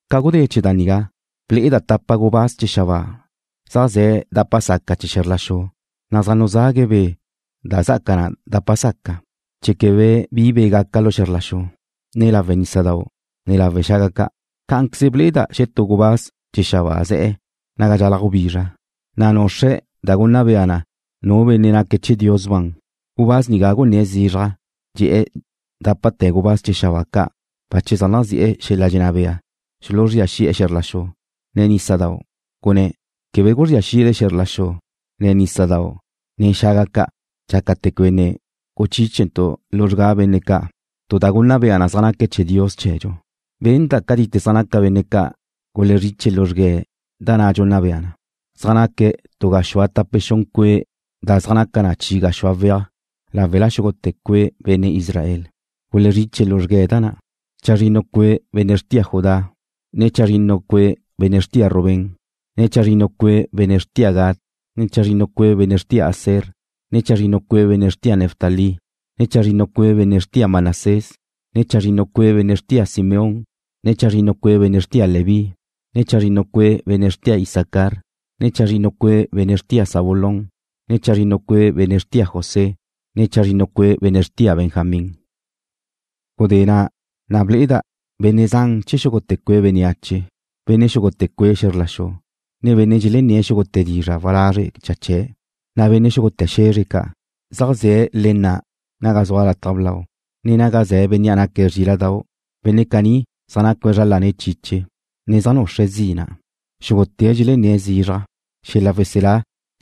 Ca gudé chee̱ da nigá, ble'eda' tapa gubáz chee̱ xabáa zaj ze̱' dapa saca chee̱ xe̱zr la xu, na' zaj nuzague̱' be' da zá'aca na dapa saca, chee̱ quebe bi be' gaca lu xe̱zr la xu, ne lawe' nísadau', ne lawe' xaga ca'. Cá'anqueze ble'eda' xetú gubáz chee̱ xabáa ze̱'e̱ naga dxalaj gubizra, na' nuxre̱' da gunna bea na nu benne' naque̱' che̱ Dios ban. Gubáz nigá gunné̱' zizraj, dxe̱'e̱ dápate̱ gubáz chee̱ xabáa ca' bache zaj nazi'e̱ xel-la' dxenná bea xuluzría xi'e̱ xe̱zr la xu, ne nísadau', gunné̱': ―Quebe guzría xile xe̱zr la xu, ne nísadau', ne xaga ca', dxácate̱ quebe ne guchíchentu' luzrgá benne' ca' tu da gunna bea na zaj naque̱' chee̱ Dios chee̱dxu. Benda' cátite zaj naca benne' ca' gulezriche luzrgue̱' da na' dxunna bea na. Zaj naque̱' tu gaxúe tape xun cue' da zaj naca na chi gaxúa weaj láwela xúgute̱ cue' benne' Israel. Gulezriche luzrgue̱' da na': Chazrinnu cue' benne' xrtia Judá, ne chazrinnu cue' benne' xrtia Rubén, ne chazrinnu cue' benne' xrtia Gad, ne chazrinnu cue' benne' xrtia Aser, ne chazrinnu cue' benne' xrtia Neftalí, ne chazrinnu cue' benne' xrtia Manasés, ne chazrinnu cue' benne' xrtia Simeón, ne chazrinnu cue' benne' xrtia Leví, ne chazrinnu cue' benne' xrtia Isacar, ne chazrinnu cue' benne' xrtia Zabulón, ne chazrinnu cue' benne' xrtia José, ne chazrinnu cue' benne' xrtia Benjamín. Gudé na' gunná'a ne ble'eda' benne' zan chee̱ xúgute̱ cue' bénneache: Benne' xúgute̱ cue' xe̱zr la xu, ne benne' dxelenné̱' xúgute̱ dizra' walazre' cha chee̱', ne benne' xúgute̱ xe̱zre ca'. Zaj ze̱' le na' naga zua lataj blau na', ne naga ze̱ Bénnea' naque̱' Zríla'dau'. Benne' caní zaj nacue̱' zra lane̱' chiche, ne zaj nuxre̱' zina'. Xúgute̱' dxelenné̱' zizraj: Xel-la' weselá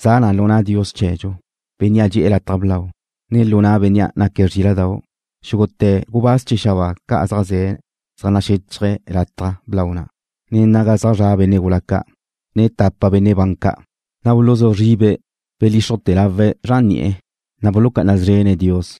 za na lu na' Dios chee̱dxu, Bénnea' dxe'e̱ lataj blau, ne lu na' Bénnea' naque̱' Zríla'dau'. Xúgute̱ gubáz chee̱ xabáa ca' zaj ze̱' zaj naxéchaje̱' lataj blau na', ne naga zaj zra' benne' gula ca', ne tapa benne' ban ca', na' buluzú zribe̱' belíxrujte̱ lawe̱' zran ni'e̱, na' bulucá'ana szrene̱' Dios.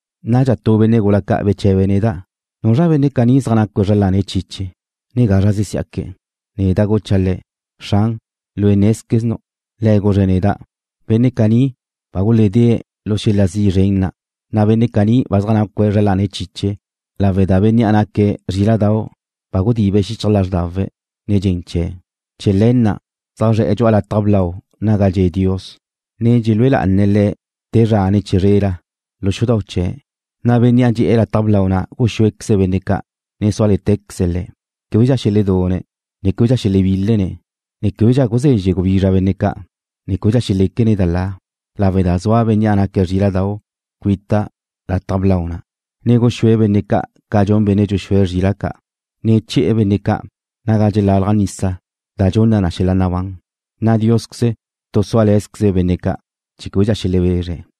Nadxa tu benne' gula ca' bche̱be̱' neda': ―¿Nuzra benne' caní zaj nacue̱' zra lane̱' chiche, ne gazra zesí'aque̱'? Neda' gucha' le̱': ―Xran, lue' nézqueznu'. Le̱' guzre̱' neda': ―Benne' caní ba guledée̱' lu xel-la' zi' zren na', na' benne' caní ba zaj nacue̱' zra lane̱' chiche lawe' da Bénnea' naque̱' Zríla'dau' ba gudibe̱' xichaj lázrdawe̱' nen dxen chee̱'. Chee̱ le̱ na' zaj zre̱'e̱ dxu'a lataj blau naga dxe' Dios, ne dxelúe lá'ane̱' Le̱' te zra ne chizrela lu xudau' chee̱', na' Bénnea' dxe'e̱ lataj blau na' guxúequeze̱' benne' ca', ne súale̱tecaze̱' le̱'. Québedxa xeledune̱' ne québedxa xelebílene̱', ne québedxa guzezxe gubizra benne' ca', ne québedxa xeléquene̱' da la, lawe' da zua Bénnea' naque̱' Zríla'dau' cuita lataj blau na', na' guxúe̱' benne' ca' ca dxun benne' dxuxúe̱' zrila' ca', ne che̱'e̱ benne' ca' naga dxelalaj nisa da dxunna na xel-la' nabán, na' Diósqueze tu súale̱zqueze̱' benne' ca' chee̱ québedxa xelebezre̱'.